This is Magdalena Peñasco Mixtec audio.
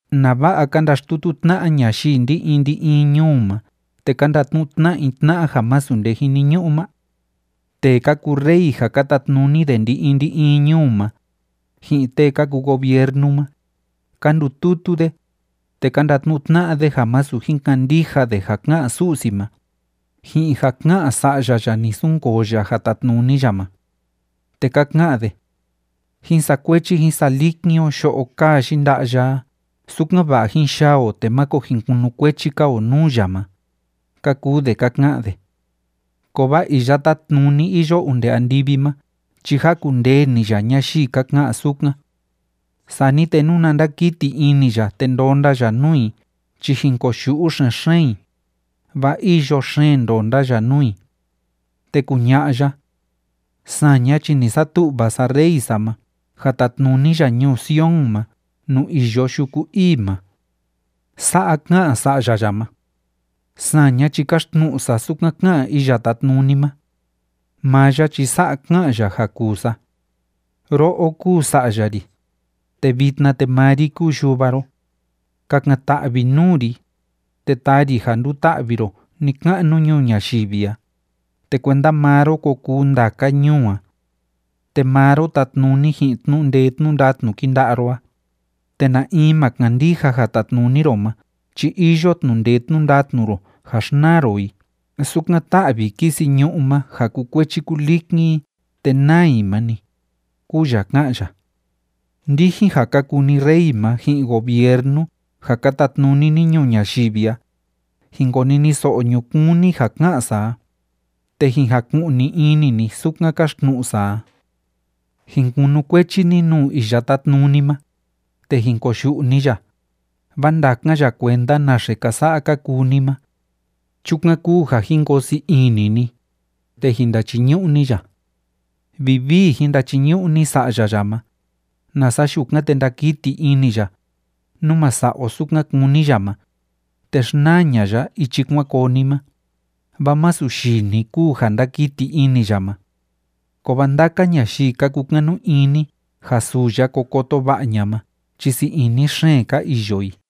¿Nava'a ka ndaxtutu tna'a ñayii ndi‑in ndi‑in ñuu ma te ka ndatnu'u tna'a i tna'a ja masu nde jiniñu'u ma? Tee ka kuu rey ja ka tatnuni de ndi‑in ndi‑in ñuu ma, ji'in tee ka kuu gobiernu ma, ka ndututu de, te ka ndatnu'u tna'a de ja masu jin kandija de ja ká'an Su'si ma, ji'in ja ká'an Sa'ya ya ni sunkoo ya ja tatnuni ya ma. Te ka ka'an de: “Jín sakuechi jín salikin o yo'o kaa yinda'a ya a, sukan‑va'a jín yaa o te máko jin kunukuechi‑ka o nuu ya ma”, ka kuu de ka ka'an de. Kovaa Iya Tátnuni iyo onde andivi ma chi jakundee‑ni ya ñayii ka ka'an sukan. Sani te nuna ndakiti ini ya te ndonda ya nuu i chi jin koyu'u xen‑xeen i, vaa îyo xeen ndonda ya nuu i. Te kuña'a ya: “Saña chi ni satu'va sa Rey sa ma ja tatnuni ya ñuu Sion ma nuu iyo yuku ii ma.” Sa'a ká'an Sa'ya ya ma: “Saña chi kaxtnu'u sa sukan ká'an Iya Tátnuni ma. Maa ya chi sa'a ká'an ya ja kuu sa: Ro'o kúu Sa'ya ri, te vitna te maa ri kúu Yuva ro. Kakan‑ta'vi nuu ri, te taa ri ja nduta'vi ro ni‑ka'nu ñuu ñayivi a, te kuenda maa ro ko kuu ndaka ñuu a. Te maa ro tatnuni ji'in tnu'u ndee tnu'u ndatnu kinda'a ro a, te na in ma kandija ja tatnuni ro ma chi iyo tnu'u ndee tnu'u ndatnu ro ja xnaa ro i sukan tá'vi kisi ñu'ú ma ja kukuechi kulikin i te naa i ma‑ni, kúu ya ká'an ya.” Ndijin ja ka kuu ni rey ma ji'in gobiernu ja ka tatnuni ni ñuu ñayivi a, jin koniniso'o ñukuun ni ja ká'an sa a, te jin jaku'ni ini ni sukan káxtnu'u sa a. Jin kunukuechi ni nuu Iya Tátnuni ma, te jin koyu'u ni ya, vaa ndakan ya kuenda naxe ka sa'a ka kuu ni ma. Chukan kúu ja jin koo sii ini ni, te jin ndachiñu'u ni ya. Vivii jin ndachiñu'u ni Sa'ya ya ma, nasa yukan te ndakiti ini ya, nú ma sa'a o sukan kúni ya ma, te xnaa ña'a ya ichi kuan koo ni ma, vaa masu yii‑ni kúu ja ndakiti ini ya ma. Kovaa ndaka ñayii ka kukanu ini ja suu ya ko koto va'a ña'a ma chi sii ini xeen ka iyo i.